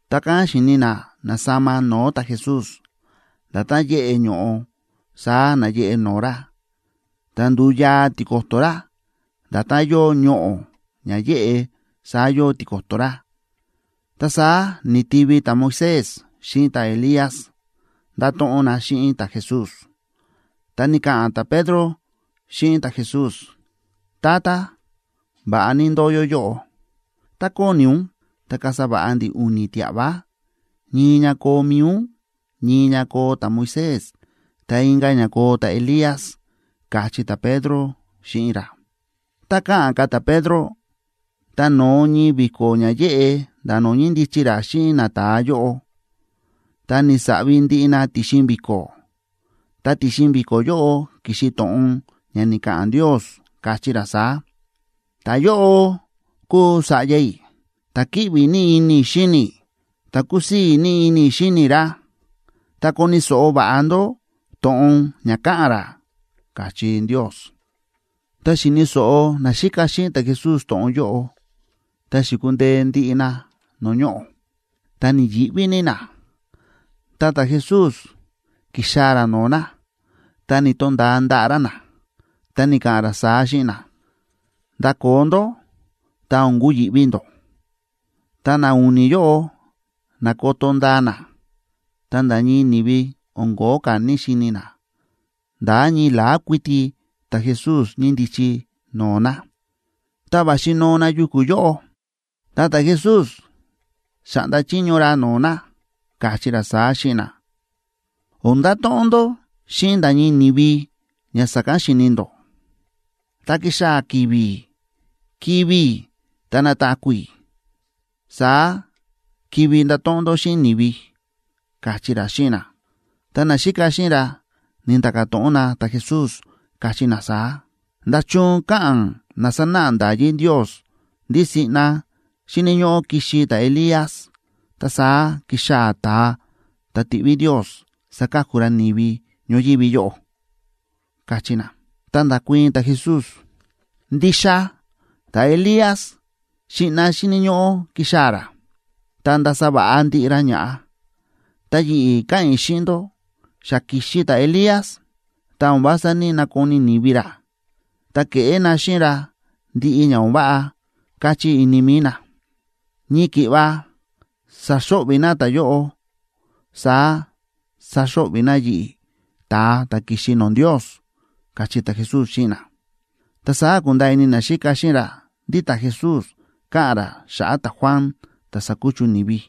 Ta kán xi̱ni na na̱sama no̱o̱ ta̱Jesús. Nda̱tán yéꞌe ño̱ꞌo saá náyeꞌe no̱o̱ ra. Ta ndu̱u yaa tiko̱to̱ ra. Nda̱tán yóo ñoꞌo̱ ña yéꞌe saá yóo tiko̱to̱ ra. Ta saá ni̱tivi ta̱Moisés xíꞌin ta̱Elías, ndáto̱ꞌon na xíꞌin ta̱Jesús. Ta ni̱ka̱ꞌa̱n ta̱Pedro xíꞌin ta̱Jesús: ―Tata, va̱ꞌa ní ndóo yó yóꞌo. Tá kóni ún, ta kasa va̱ꞌa ndi̱ u̱ni̱ tia̱ꞌva, ñii ña koo mi̱i ún, ñii ña koo ta̱Moisés, ta inka̱ ña koo ta̱Elías ―káchí ta̱Pedro xíꞌin ra. Tá káꞌa̱n ka̱ ta̱Pedro, ta no̱o ñii vi̱ko̱ ña yéꞌe nda̱ no̱o̱ ñíndichi ra xíꞌin nata̱a yóꞌo, ta ni̱saꞌvi ndiꞌi na ti̱xin vi̱ko̱. Ta ti̱xin vi̱ko̱ yóꞌo ki̱xi to̱ꞌon ña ni̱ka̱ꞌa̱n Ndios, káchí ra saá: ―Ta̱yóꞌo kúu Sa̱ꞌya i̱, ta̱ kíꞌvi ní ini i̱ xíni i̱, ta kúsii̱ ní ini i̱ xíni i̱ ra. Ta koni̱ so̱ꞌo va̱ꞌa ndó to̱ꞌon ña káꞌa̱n ra ―káchí Ndios. Tá xi̱ni̱ so̱ꞌo naxíka xíꞌin ta̱Jesús to̱ꞌon yóꞌo, ta xi̱kundee ndiꞌi na no̱o̱ ñoꞌo̱, ta ni̱yi̱ꞌví ní na. Ta ta̱Jesús ki̱xaa̱ ra no̱o̱ na, ta ni̱to̱nda̱a ndaꞌa̱ ra na, ta ni̱ka̱ꞌa̱n ra saá xíꞌin na: ―Ndakoo ndó. Ta o̱n kuyi̱ꞌví ndó. Tá na u̱ni̱ yóꞌo na̱koto ndaa na, ta nda̱ ñii ni̱vi o̱n ko̱ó ka̱ ni̱‑xini na, nda̱ ñii la̱á kuiti ta̱Jesús ñíndichi no̱o̱ na. Tá va̱xi noo na yuku̱ yóꞌo, ta ta̱Jesús xa̱ꞌnda chiño ra no̱o̱ na, káchí ra saá xíꞌin na: ―O̱n ndato̱ꞌon ndó xíꞌin nda̱ ñii ni̱vi ña sa̱kán xi̱ni ndó. Tá kixaa̱ ki̱vi̱ kivi̱ i̱ ta nataku̱ i̱, saá kivi ndato̱ꞌon ndó xíꞌin ni̱vi ―káchí ra xíꞌin na. Ta naxíka xíꞌin ra ni̱nda̱ka̱ to̱ꞌon na ta̱Jesús, káchí na saá: ―¿Nda̱chun káꞌa̱n na sánáꞌa nda̱yí Ndios ndí siꞌna xíni̱ ñóꞌó kixi ta̱Elías, ta saá kixaa̱ ta̱a ta̱ tiꞌví Ndios saka̱ku ra ni̱vi ñoyívi yóꞌo? ―káchí na. Ta nda̱kuii̱n ta̱Jesús: ―Ndixa ta̱Elías siꞌna xíni̱ ñóꞌó kixaa̱ ra, ta ndasa va̱ꞌa ndiꞌi ra ña̱ꞌa. Ta yi̱ꞌi̱ káꞌa̱n i̱ xíꞌin ndó, xa ki̱xi ta̱Elías, ta o̱n vása ní‑nakoni ni̱vi ra, ta ke̱ꞌé na xíꞌin ra ndiꞌi ña o̱n váꞌa káchí ini mi̱i na. Ñii ki̱ꞌva sa̱xo̱ꞌvi̱ na ta̱yóꞌo, saá saxo̱ꞌvi̱ na yi̱ꞌi̱, ta̱a ta̱ ki̱xi no̱o̱ Ndios ―káchí ta̱Jesús xíꞌin na. Ta saá ku̱nda̱a̱ ini naxíka xíꞌin ra ndí ta̱Jesús káꞌa̱n ra xa̱ꞌa̱ ta̱Juan, ta̱ sa̱kuchu ni̱vi.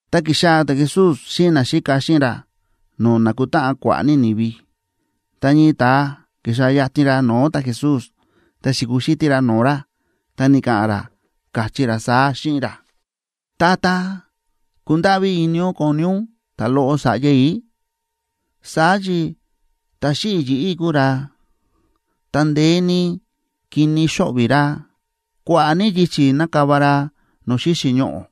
Ta ki̱xaa̱ ta̱Jesús xíꞌin naxíka xíꞌin ra no̱o̱ nákutáꞌan kua̱ꞌa̱ ní ni̱vi, ta ñii ta̱a ki̱xaa̱ yatin ra no̱o̱ ta̱Jesús, ta xi̱kuxítí ra no̱o̱ ra. Ta ni̱ka̱ꞌa̱n ra, káchí ra saá xíꞌin ra: ―Tata, kundáꞌví ini ún koni ún ta̱loꞌo sa̱ꞌya i̱. Saá chi ta̱ xíꞌi̱ yi̱ꞌí kúu ra, ta ndeé ní kini xóꞌvi̱ ra. Kua̱ꞌa̱ ní yichi̱ nákava ra no̱o̱ xíxi̱ ñoꞌo̱,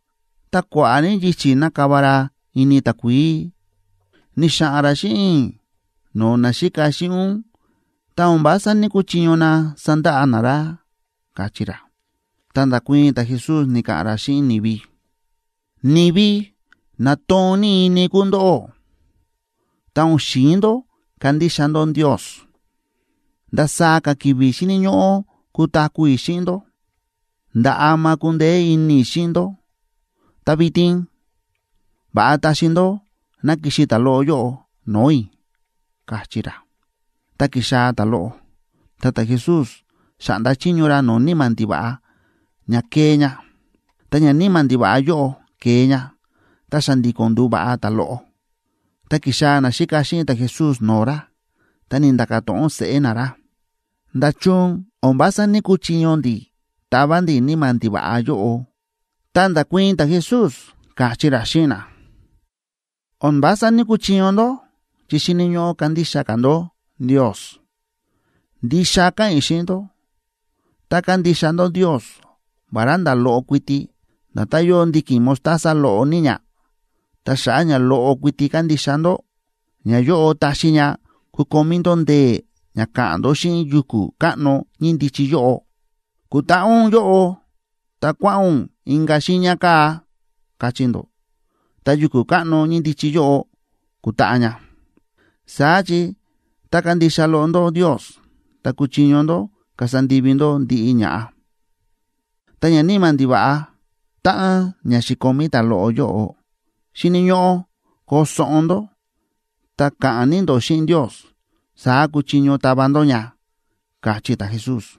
ta kua̱ꞌa̱ ní yichi̱ nákava ra ini takuií. Ni̱xa̱ꞌa̱n ra xíꞌin i̱ no̱o̱ naxíka xíꞌin ún, ta o̱n vása ní‑kuchiño na sandaꞌa na ra ―káchí ra. Ta nda̱kuii̱n ta̱Jesús, ni̱ka̱ꞌa̱n ra xíꞌin ni̱vi: ―¡Ni̱vi na toon ní ini kúu ndóꞌó, ta o̱n xi̱in ndó kandixa ndó Ndios! ¿Ndasaá ka̱ ki̱vi̱ xíni̱ ñóꞌó kutaku̱ i̱ xíꞌin ndó? ¿Nda̱ ama kundeé ini i̱ xíꞌin ndó? Ta vitin, va̱ꞌa taxi ndó ná kixi ta̱loꞌo yóꞌo no̱o̱ i̱ ―káchí ra. Ta ki̱xaa̱ ta̱loꞌo ta ta̱Jesús xa̱ꞌnda chiño ra no̱o̱ níma̱ ndiva̱ꞌa ña kee ña. Ta ñaníma̱ ndiva̱ꞌa yóꞌo ke̱e ña, ta xa̱ndi̱ko̱n ndu̱va̱ꞌa ta̱loꞌo. Ta ki̱xaa̱ naxíka xíꞌin ta̱Jesús no̱o̱ ra, ta ni̱nda̱ka̱ to̱ꞌon seꞌé na ra: ―¿Nda̱chun o̱n vása ní‑kuchiño ndi̱ tava ndi̱ níma̱ ndiva̱ꞌa yóꞌo? Ta nda̱kuii̱n ta̱Jesús, káchí ra xíꞌin na: ―O̱n vása ní‑kuchiño ndó chi xíni̱ ñóꞌó kandixa ka̱ ndó Ndios. Ndixa káꞌa̱n i̱ xíꞌin ndó, tá kandixa ndó Ndios vará nda̱ loꞌo kuiti, nda̱tán yóo ndiki̱n mostaza loꞌo ní ña, ta xa̱ꞌa̱ ña loꞌo kuiti kandixa ndó, ñayóꞌo taxi ña kukomí ndó ndee̱ ña ka̱ꞌa̱n ndó xíꞌin yuku̱ káꞌno ñíndichi yóꞌo: “Kutaꞌa ún yóꞌo ta kua̱ꞌa̱n ún inka̱ xiiña kaa̱”, kachí ndó, ta yuku̱ káꞌno ñíndichi yóꞌo kutaꞌa ña. Saá chi tá kándixa loꞌo ndó Ndios, ta kuchiño ndó kasa ndivi ndó ndiꞌi ña̱ꞌa. Ta ñaníma̱ ndiva̱ꞌa táꞌan ña xi̱komí ta̱loꞌo yóꞌo, xíni̱ ñóꞌó koo soꞌon ndó ta ka̱ꞌa̱n ní ndó xíꞌin Ndios, saá kuchiño tava ndó ña ―káchí ta̱Jesús.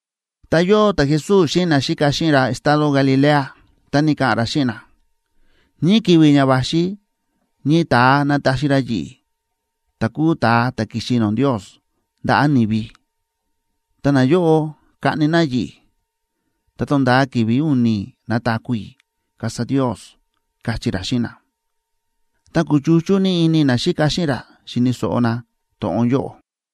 Ta yóo ta̱Jesús xíꞌin naxíka xíꞌin ra estado Galilea, ta ni̱ka̱ꞌa̱n ra xíꞌin na: ―Ñii ki̱vi̱ ña va̱xi ñii ta̱a nataxi ra yi̱ꞌi̱, ta̱ kúu ta̱a ta̱ ki̱xi no̱o̱ Ndios, ndaꞌa̱ ni̱vi. Ta nayóꞌo kaꞌni na yi̱ꞌi̱, ta tonda̱a ki̱vi̱ u̱ni̱ nataku̱ i̱, kasa Ndios ―káchí ra xíꞌin na. Ta kúchuchú ní ini naxíka xíꞌin ra xi̱ni̱ so̱ꞌo na to̱ꞌon yóꞌo.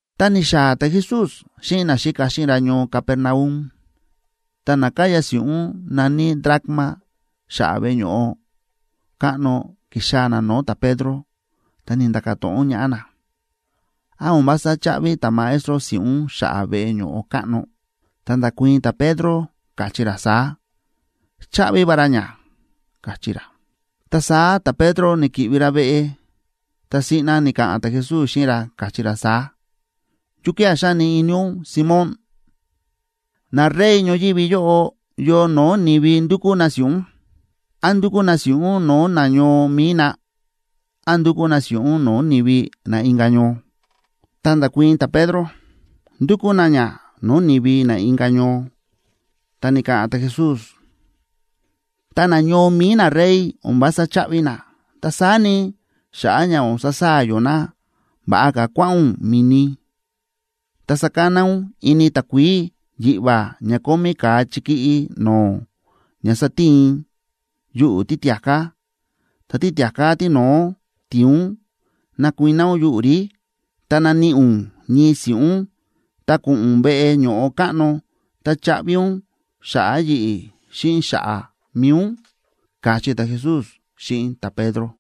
Tá ni̱xaa̱ ta̱Jesús xíꞌin naxíka xíꞌin ra ñoo Capernaum, ta na káya si̱ꞌún na̱ní dracma xa̱ꞌa̱ veꞌe ño̱ꞌo káꞌno ki̱xaa̱ na no̱o̱ ta̱Pedro, ta ni̱nda̱ka̱ to̱ꞌon ñaꞌá na: ―¿Án o̱n vása cháꞌvi ta̱Maestro si̱ꞌún xa̱ꞌa̱ veꞌe ño̱ꞌo káꞌno? Ta nda̱kuii̱n ta̱Pedro, káchí ra saá: ―Cháꞌvi va ra ña ―káchí ra. Ta saá ta̱Pedro ni̱ki̱ꞌvi ra veꞌe, ta siꞌna ni̱ka̱ꞌa̱n ta̱Jesús xíꞌin ra, káchí ra saá: ―¿Yukía̱ xáni ini ún, Simón? Narey ñoyívi yóꞌo, ¿yo no̱o̱ ni̱vi ndúkú na si̱ꞌún? ¿Án ndúkú na si̱ꞌún no̱o̱ nañoo mi̱i na, án ndúkú na si̱ꞌún no̱o̱ ni̱vi na inka̱ ñoo? Ta nda̱kuii̱n ta̱Pedro: ―Ndúkú na ña no̱o̱ ni̱vi na inka̱ ñoo. Ta ni̱ka̱ꞌa̱n ta̱Jesús: ―Ta na ñoo mi̱i narey o̱n vása cháꞌvi na. Ta saá ni, xa̱ꞌa̱ ña o̱n sasaa̱ yó na, va̱ꞌa ka̱ kua̱ꞌa̱n ún mi̱ni, ta sakana ún ini takuií yiꞌva̱ ña kómí ka̱a chikíꞌí no̱o̱ ña satiin yuꞌu̱ títia̱ká, ta títia̱ká tíno̱ó ti̱in ún nakuiná ún yuꞌu̱ rí, ta naníꞌi ún ñii si̱ꞌún, ta ko̱ꞌo̱n ún veꞌe ño̱ꞌo káꞌno, ta chaꞌvi ún xa̱ꞌa̱ yi̱ꞌi̱ xíꞌin xa̱ꞌa̱ mi̱i ún ―káchí ta̱Jesús xíꞌin ta̱Pedro.